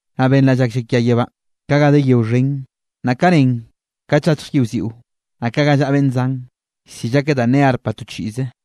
Naꞌ benraꞌ llak llakia yebánꞌ, ka ga de yeo xhen, naꞌ ka nen kat llachj yiꞌwziꞌo, naꞌ ka ga llaꞌa beꞌnn zan, llsill akeꞌ danꞌ ne arpa to chiꞌze.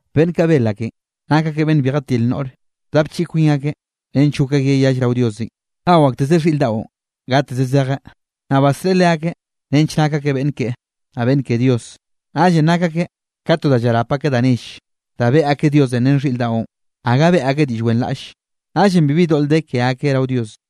Beꞌnn kaꞌ bel akeꞌn nak ake beꞌnn bi jatil noꞌre, bdapchiꞌi kwin akeꞌ nench gok akeꞌ yall rao Diosenꞌ. Nao aktezeꞌ xhiꞌr daꞌon gateze zejeꞌ, naꞌ basreꞌe leakeꞌ nench nak akeꞌ beꞌnn keꞌe, naꞌ beꞌnn ke Dios. Naꞌllenꞌ nak akeꞌ ka to da llarap akeꞌ da nelle, da beꞌe akeꞌ Diosenꞌ ren xhiꞌr daꞌon. Gaga beꞌe akeꞌ diꞌll wenraꞌlle, naꞌllenꞌ bibi doꞌl de ke akeꞌ rao Dios.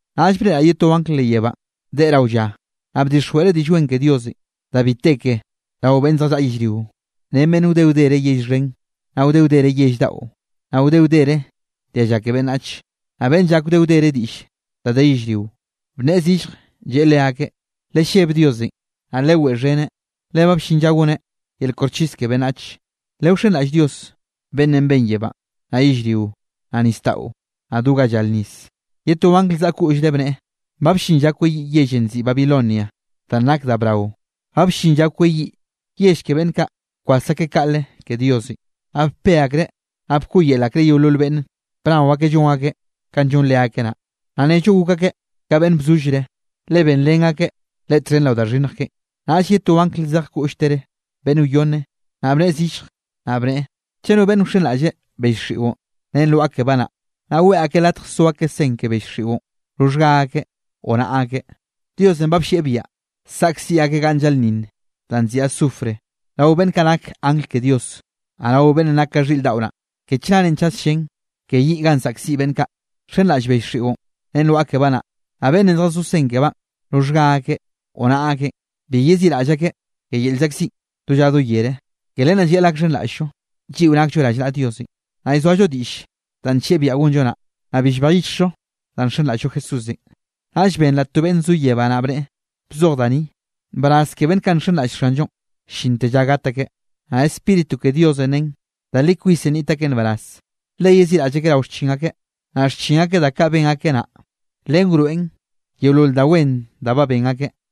Naꞌll breꞌraꞌ ye to angl leꞌ yebánꞌ deꞌe rao lla. Naꞌ bdixjweꞌreꞌ Diꞌll Wen ke Diosenꞌ da bi te ke rao beꞌnn zjallaꞌa yellrio, ren beꞌnn wde wdere yell xhen, naꞌ wde wdere yell daꞌo, naꞌ wde wdere dialla ke beꞌnnach, naꞌ beꞌnn llak wde wdere diꞌll da de yellrio. Bnneꞌe zillje, lleꞌe leakeꞌ: —Lelleb Diosenꞌ, naꞌ leweꞌxheneꞌ, le ba bllin lla goneꞌ yel koxchis ke beꞌnnach. Lewxenraꞌll Dios beꞌnnenꞌ ben yebánꞌ, naꞌ yellrio, naꞌ nisdaꞌo, naꞌ do ga llar nis. Ye to angl zaꞌa koꞌllre, bneꞌe: —Ba bllin lla kweyiꞌ yellenꞌ nziꞌi Babilonia danꞌ nak da brao. Ba bllin lla kweyiꞌ yell ke beꞌnn kaꞌ bkwas akeꞌ kaꞌle ke Diosenꞌ, naꞌ bpe akreꞌ, naꞌ bkoꞌyel akreꞌ yeolol beꞌnne bnao ake llon akeꞌ kanꞌ llon leakeꞌ naꞌ, naꞌ nnello gok akeꞌ ka beꞌnn bzollreꞌ, le benrén akeꞌ leꞌe txhen rao da xhinnj keꞌen. Naꞌll ye to angl zej koꞌlltere beꞌnn wyonne, naꞌ bnneꞌe zillje, naꞌ bneꞌe: —Chaꞌ no beꞌnne wxenraꞌlle bell xiꞌon ren lwaꞌa kebaꞌ naꞌ, naꞌ weꞌe akeꞌ latje so akeꞌ sen ke bell xiꞌon roxhga akeꞌ o naꞌa akeꞌ, Diosenꞌ ba bllieꞌ biaꞌa saꞌkziꞌ akeꞌ ganꞌ llaꞌlnninn danꞌ nziꞌi azufre rao beꞌnn kaꞌ nak angl ke Dios, naꞌ rao beꞌnnenꞌ nak ka xhiꞌr daꞌo naꞌ. Ke chnare chas llén ke yiꞌ ganꞌ saꞌkziꞌ beꞌnn kaꞌ nxenraꞌll bell xiꞌon ren lwaꞌa kebaꞌ naꞌ, naꞌ beꞌnne zjazó sen kebaꞌn roxhga akeꞌ o naꞌa akeꞌn, bi yeziꞌraꞌll akeꞌ ke yel llzaꞌkziꞌn do lla do yere. Ke len naꞌ llayaꞌl gakxhenraꞌll-llo, lliꞌo nakllo rallnaꞌa Diosenꞌ, naꞌ llzoallo diꞌll danꞌ nllieꞌ biaꞌa gonllo naꞌ, naꞌ bi llbej yichjllo danꞌ nxenraꞌll-llo Jesúsenꞌ. Naꞌll benraꞌ to beꞌnn zo yebánꞌ naꞌ bneꞌe: —Bzoj da ni: “Nbaraz ke beꞌnn kaꞌ nxenraꞌll Xanllonꞌ llinte lla gat akeꞌ.” Naꞌ Spíritu ke Diosenꞌ nen: —Da li kwisenꞌ nniꞌt akeꞌ nbaraz, le yeziꞌraꞌll akeꞌ rao xchin akeꞌ, naꞌ xchin akeꞌ da kaꞌ ben akeꞌ naꞌ, len wroeꞌn yeolol da wen da ba ben akeꞌ.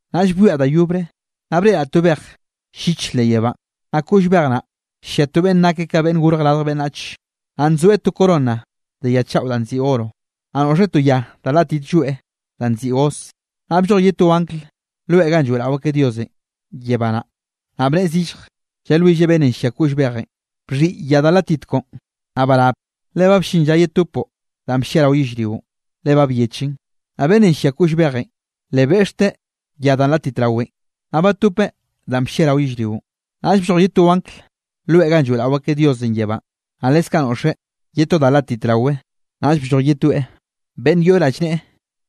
Naꞌll bwiaꞌ da yobre, naꞌ breꞌraꞌ to bej lliche leꞌ yebánꞌ, naꞌ koꞌll bej naꞌ llia to beꞌnne nake ka Beꞌnnenꞌ Gorj Radj Beꞌnnach. Naꞌ nzoeꞌ to corona de ya chaꞌo danꞌ nziꞌi oro, naꞌ noꞌxeꞌ to ya da látit lloeꞌ danꞌ nziꞌi hoz. Naꞌ blloj ye to angl loe ganꞌ lloeꞌrao akeꞌ Diosenꞌ yebá naꞌ, naꞌ bnneꞌe zillje, llalwilleꞌ beꞌnnenꞌ llia koꞌll bejenꞌ: —Bxhiꞌi ya da látit koꞌon, naꞌ barap, le ba bllin lla yetopoꞌ danꞌ bllia rao yellrionꞌ, le ba byechen. Naꞌ beꞌnnenꞌ llia koꞌll bejenꞌ, le beꞌxteꞌ ya danꞌ látit rawenꞌ, naꞌ batopeꞌ danꞌ bllia rao yellrionꞌ. Naꞌll blloj ye to angl loe ganꞌ lloeꞌrao akeꞌ Diosenꞌ yebánꞌ, naꞌ leskaꞌ noꞌxeꞌ ye to da látit rawe. Naꞌll blloj ye toeꞌ beꞌnn yoꞌ rallneꞌe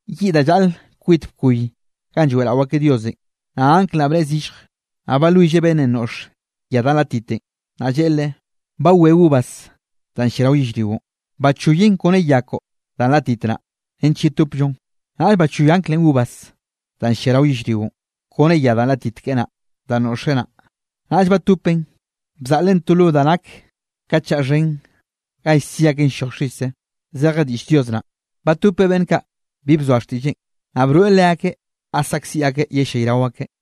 yiꞌ da llaꞌle kwit bkoy ganꞌ lloeꞌrao akeꞌ Diosenꞌ. Naꞌ angl naꞌ bnneꞌe zillje, naꞌ balwilleꞌ beꞌnnenꞌ noꞌx ya da látitenꞌ, naꞌ lleꞌe leꞌe: —Ba we uvas danꞌ llia rao yellrionꞌ. Bachoyen kone ya koꞌo danꞌ nlátit naꞌ, nench yetopllon. Naꞌll bachoy anglenꞌ uvas danꞌ llia rao yellrionꞌ kone ya danꞌ látit keꞌe naꞌ, danꞌ noꞌxeꞌ naꞌ, naꞌll batopeꞌn bzaꞌleꞌn to lo da nak ka chaꞌ xhen ga llsi akeꞌn lloj xise. Zeje diꞌll Dios naꞌ, batopeꞌ beꞌnn kaꞌ bi bzoa xtiꞌlleꞌn, naꞌ broeꞌ leakeꞌ ga saꞌkziꞌ akeꞌ yellayrao akeꞌ.